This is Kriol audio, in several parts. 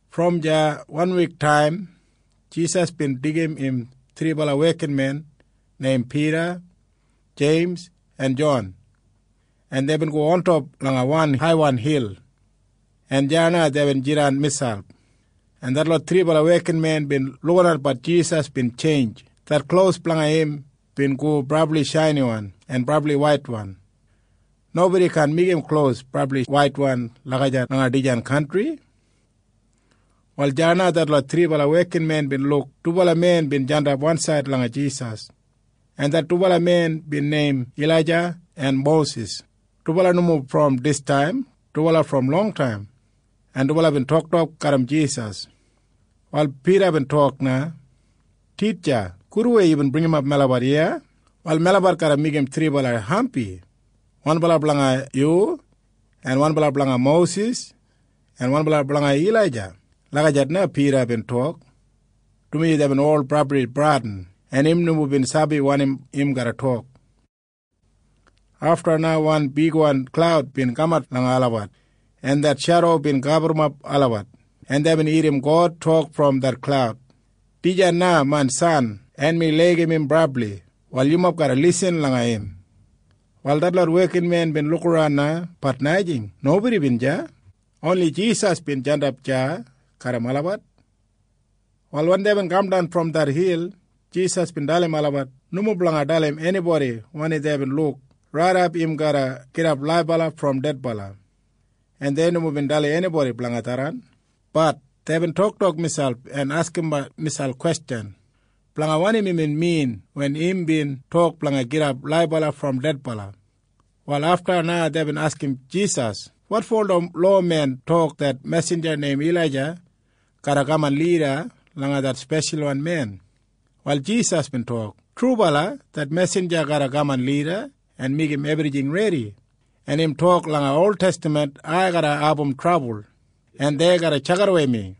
Brom deya wanwiktaim Jisas bin deigim im thribala wekinmen neim Pida, Jeims en Jon, en deibin go ontop langa wan haiwan hil, en deya na deibin jidan miselp, en detlot thribala wekinmen bin lukinatbat Jisas bin tjeinj. Det klos blanga im bin go brabli shainiwan en brabli waitwan. Nobodi kaan meigim klos brabli waitwan lagijat langa dijan kantri. Wal deya na detlot thribala wekinmen bin luk dubala men bin jandap wansaid langa Jisas, en det dubala men bin neim Ilaija en Mosis. Dubala nomo brom distaim. Dubala brom longtaim, en dubala bin toktok garram Jisas. Wal Pida bin tok na, “Titja, gudwei yubin bringimap melabat iya. Wal melabat garra meigim thribala hampi. Wanbala blanga yu en wanbala blanga Mosis en wanbala blanga Ilaija.” Lagijat na Pida bin tok, dumaji deibin ol brabli bradin, en im nomo bin sabi wanim im garra tok. Afta na wan bigwan klaud bin kamat langa olabat, en det shedo bin gaburrumap olabat, en deibin irrim God tok brom det klaud, “Dijan main san, en mi laigim im brabli. Wal yumob garra lisin langa im.” Wal detlot wekinmen bin lukaran na. Bat najing. Nobodi bin deya. Oni Jisas bin jandap deya garram olabat. Wal wen deibin kamdan brom det hil, Jisas bin dalim olabat nomo blanga dalim enibodi wanim deibin luk raidap im garra gidap laibala brom dedbala, en dei nomo bin dalim enibodi blanga tharran. Bat deibin toktok miselp en askimbat miselp kwestjan blanga wanim imbin min wen imbin tok blanga gidap laibala brom dedbala. Wal afta na deibin askim Jisas, “Wotfo ola lowamen tok det mesinja neim Ilaija garra kaman lida langa det Speshalwan Men?” Wal Jisas bin tok, “Trubala det mesinja garra kaman lida en meigim ebrijing redi, en im tok langa oltestaman ai garra abum trabul, en dei garra tjakidawei mi.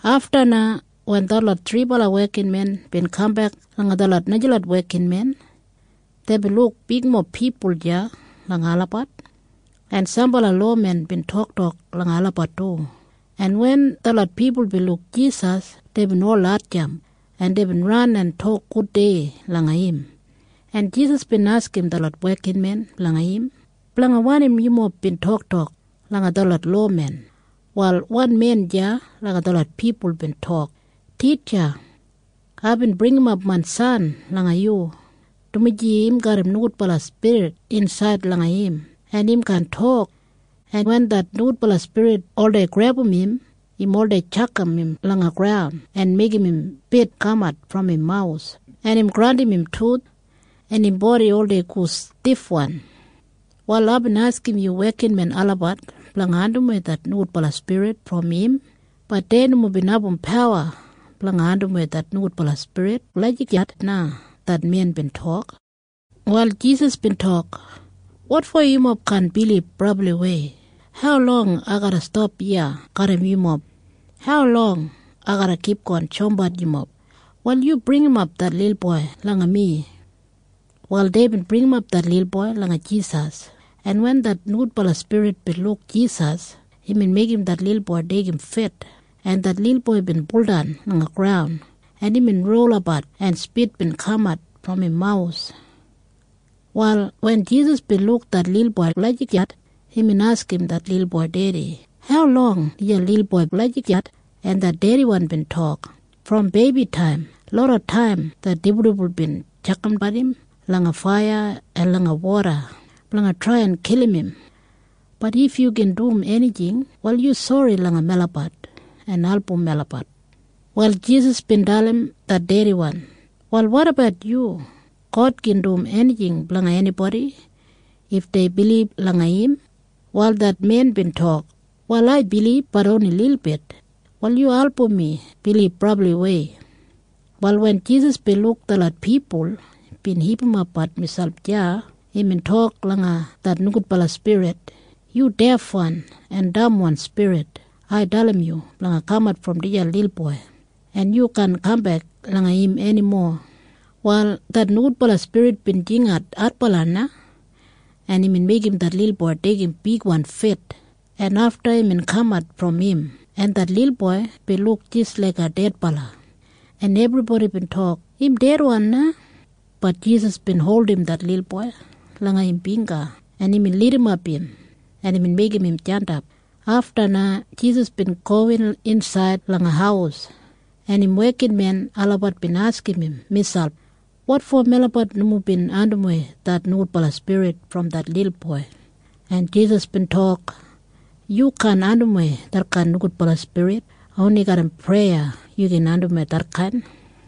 Afta na wen detlot thribala wekinmen bin kambek langa detlot najalot wekinmen, deibin luk bigmob pipul deya langa olabat, en sambala lowamen bin toktok langa olabat du. En wen detlot pipul bin luk Jisas, deibin ol hatjamp, en deibin ran en tok gudei langa im, en Jisas bin askim detlot wekinmen blanga im, “Blanga wanim yumob bin toktok langa detlot lowamen?” Wal wan men deya langa detlot pipul bin tok, “Titja, aibin bringimap main san langa yu, dumaji im garram nogudbala spirit insaid langa im, en im kaan tok. En wen det nogudbala spirit oldei grebum im, im oldei tjakam im langa graun en meigim spit kamat brom im mawus, en im grandim im tuth, en im bodi oldei go stifwan. Wal aibin askim yu wekinmen olabat blanga andimwei det nogudbala spirit brom im. Bat dei nomo bin abum pawa blanga andimwei det nogudbala spirit.” Lagijat na det men bin tok. Wal Jisas bin tok, “Wotfo yumob kaan bilib brabliwei? Haulong ai garra stap iya garram yumob? Haulong ai garra kipgon shoumbat yumob? Wal yu bringimap det lilboi langa mi.” Wal deibin bringimap det lilboi langa Jisas, en wen det nogudbala spirit bin luk Jisas, imbin meigim det lilboi deigim fit, en det lilboi bin buldan langa graun, en imbin rolabat, en spit bin kamat brom im mawus. Wal wen Jisas bin luk det lilboi lagijat, imbin askim det lilboi dedi, “Haulong dijan lilboi bin lagijat?” En det dediwan bin tok, “Brom beibitaim. Lodataim det dibuldibul bin tjakambat im langa faiya en langa woda blanga trai en kilim im. Bat if yu gin dum enijing, wal yu sori langa melabat en album melabat.” Wal Jisas bin dalim det dediwan, “Wal wotabat yu? God gin dum enijing blanga enibodi if dei bilib langa im.” Wal det men bin tok, “Wal ai bilib. Bat oni lilbit. Wal yu album mi bilib brabliwei.” Wal wen Jisas bin luk detlot pipul bin hipimapbat miselp deya, imbin tok langa det nogudbala spirit, “Yu defwan en damwan spirit, ai dalim yu blanga kamat brom dijan lilboi, en yu kaan kambek langa im enimo!” Wal det nogudbala spirit bin jingat adbala na, en imbin meigim det lilboi deigim bigwan fit, en afta imbin kamat brom im, en det lilboi bin luk jis laiga dedbala, en ebribodi bin tok, “Im dedwan na!” Bat Jisas bin holdim det lilboi langa im bingga, en imbin lidimap im, en imbin meigim im jandap. Afta na Jisas bin gowin insaid langa haus, en im wekinmen olabat bin askim im miselp, “Wotfo melabat nomo bin andimwei det nogudbala spirit brom det lilboi?” En Jisas bin tok, “Yu kaan andimwei detkain nogudbala spirit. Oni garram preya yu gin andimwei detkain.”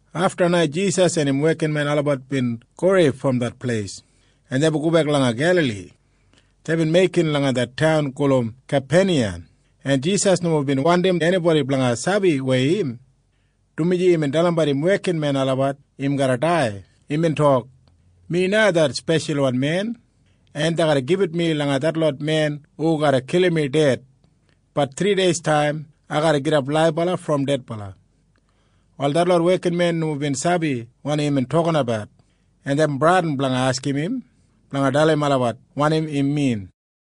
Afta na Jisas en im wekinmen olabat bin gowei brom det pleis, en deibin gobek langa Gelali. Deibin meikin langa det taun gulum Kapeniyam, en Jisas nomo bin wandim enibodi blanga sabi weya im, dumaji imbin dalimbat im wekinmen olabat im garra dai. Imbin tok, “Mi na det Speshalwan Men, en dei garra gibit mi langa detlot men hu garra kilim mi ded. Bat thrideistaim ai garra gidap laibala brom dedbala.” Wal detlot wekinmen nomo bin sabi wanim imbin tokinabat, en deibin bradin blanga askim im blanga dalim olabat wanim imbin min.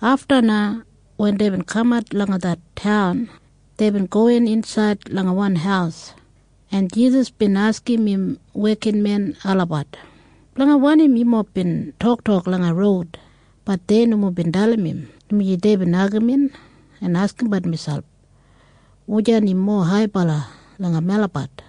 Afta na wen deibin kamat langa det taun, deibin gowin insaid langa wan haus, en Jisas bin askim im wekinmen olabat, “Blanga wanim yumob bin toktok langa roud?” Bat dei nomo bin dalim im, dumaji deibin agamin en askimbat miselp, “Wujan im mowa haibala langa melabat?”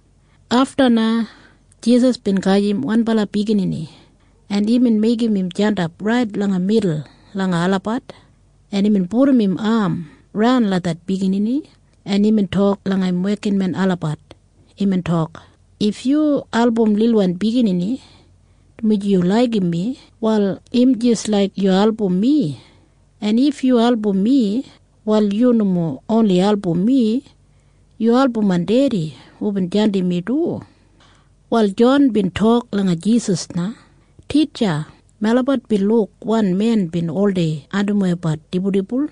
Afta na Jisas bin gajim wanbala biginini, en imbin meigim im jandap rait langa midul langa olabat, en imbin pudum im am raun langa det biginini, en imbin tok langa im wekinmen olabat. Imbin tok, “If yu album lilwan biginini dumaji yu laigim mi, wal im jis laik yu album mi. En if yu album mi, wal yu nomo oni album mi. Yu album main Dedi hubin jandim mi du.” Wal Jon bin tok langa Jisas na, “Titja, melabat bin luk wan men bin oldei andimwei dibuldibul,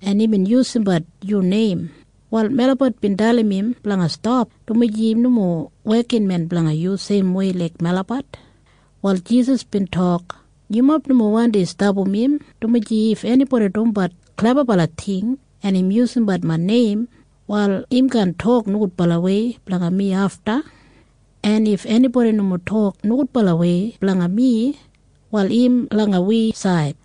en imbin yusumbat yu neim. Wal melabat bin dalim im blanga stap, dumaji im nomo wekinmen blanga yu seimwei laik melabat.” Wal Jisas bin tok, “Yumob nomo wandi stapam im, dumaji if enibodi dumbat klebabala ting, en im yusumbat main neim, wal im kaan tok nogudbalawei blanga mi afta. En if enibodi nomo tok nogudbalawei blanga mi, wal im langa wi said.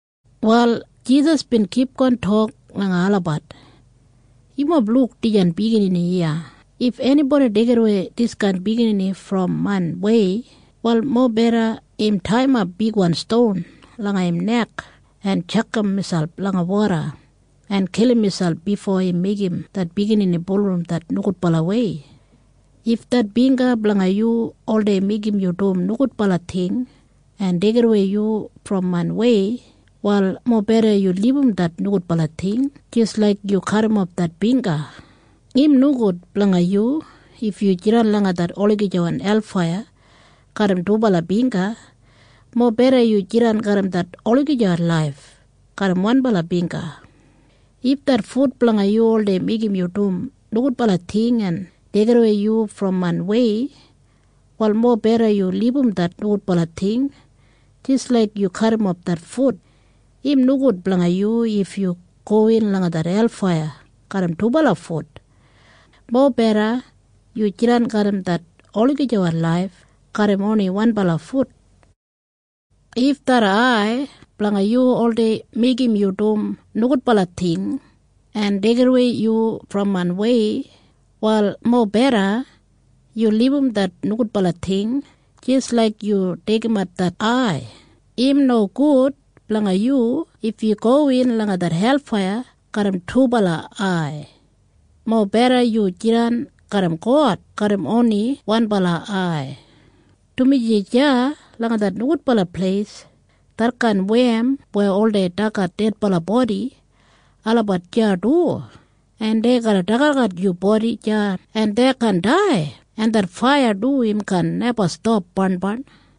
Wal Jisas bin kipgon tok langa olabat, “Yumob luk dijan biginini iya. If enibodi deigidawei diskain biginini brom main wei, wal mobeda im taiyimap bigwan ston langa im nek en tjakam miselp langa woda en kilim miselp bifo im meigim det biginini bulurrum det nogudbalawei. If det bingga blanga yu oldei meigim yu dum nogudbala ting en deigidawei yu brom main wei, wal mobeda yu libum det nogudbala ting jis laik yu kadimof det bingga. Im nogud blanga yu if yu jidan langa det olagijawan helfaiya garram dubala bingga. Mobeda yu jidan garram det olagijawan laif garram wanbala bingga. If det fut blanga yu oldei meigim yu dum nogudbala ting en deigidawei yu brom main wei, wal mobeda yu libum det nogudbala ting jis laik yu kadimof det fut. Im nogud blanga yu if yu gowin langa det helfaiya garram dubala fut. Mobeda yu jidan garram det olagijawan laif garram oni wanbala fut. If det ai blanga yu oldei meigim yu dum nogudbala ting en deigidawei yu brom main wei, wal mobeda yu libum det nogudbala ting jis laik yu deigimat det ai. Im nogud blanga yu if yu gowin langa det helfaiya garram dubala ai. Mobeda yu jidan garram God garram oni wanbala ai. Dumaji deya langa det nogudbala pleis, detkain wem weya oldei dagat dedbala bodi, olabat deya du, en dei garra dagadagat yu bodi deya du, en dei kaan dai, en det faiya du im kaan neba stap barnbarn.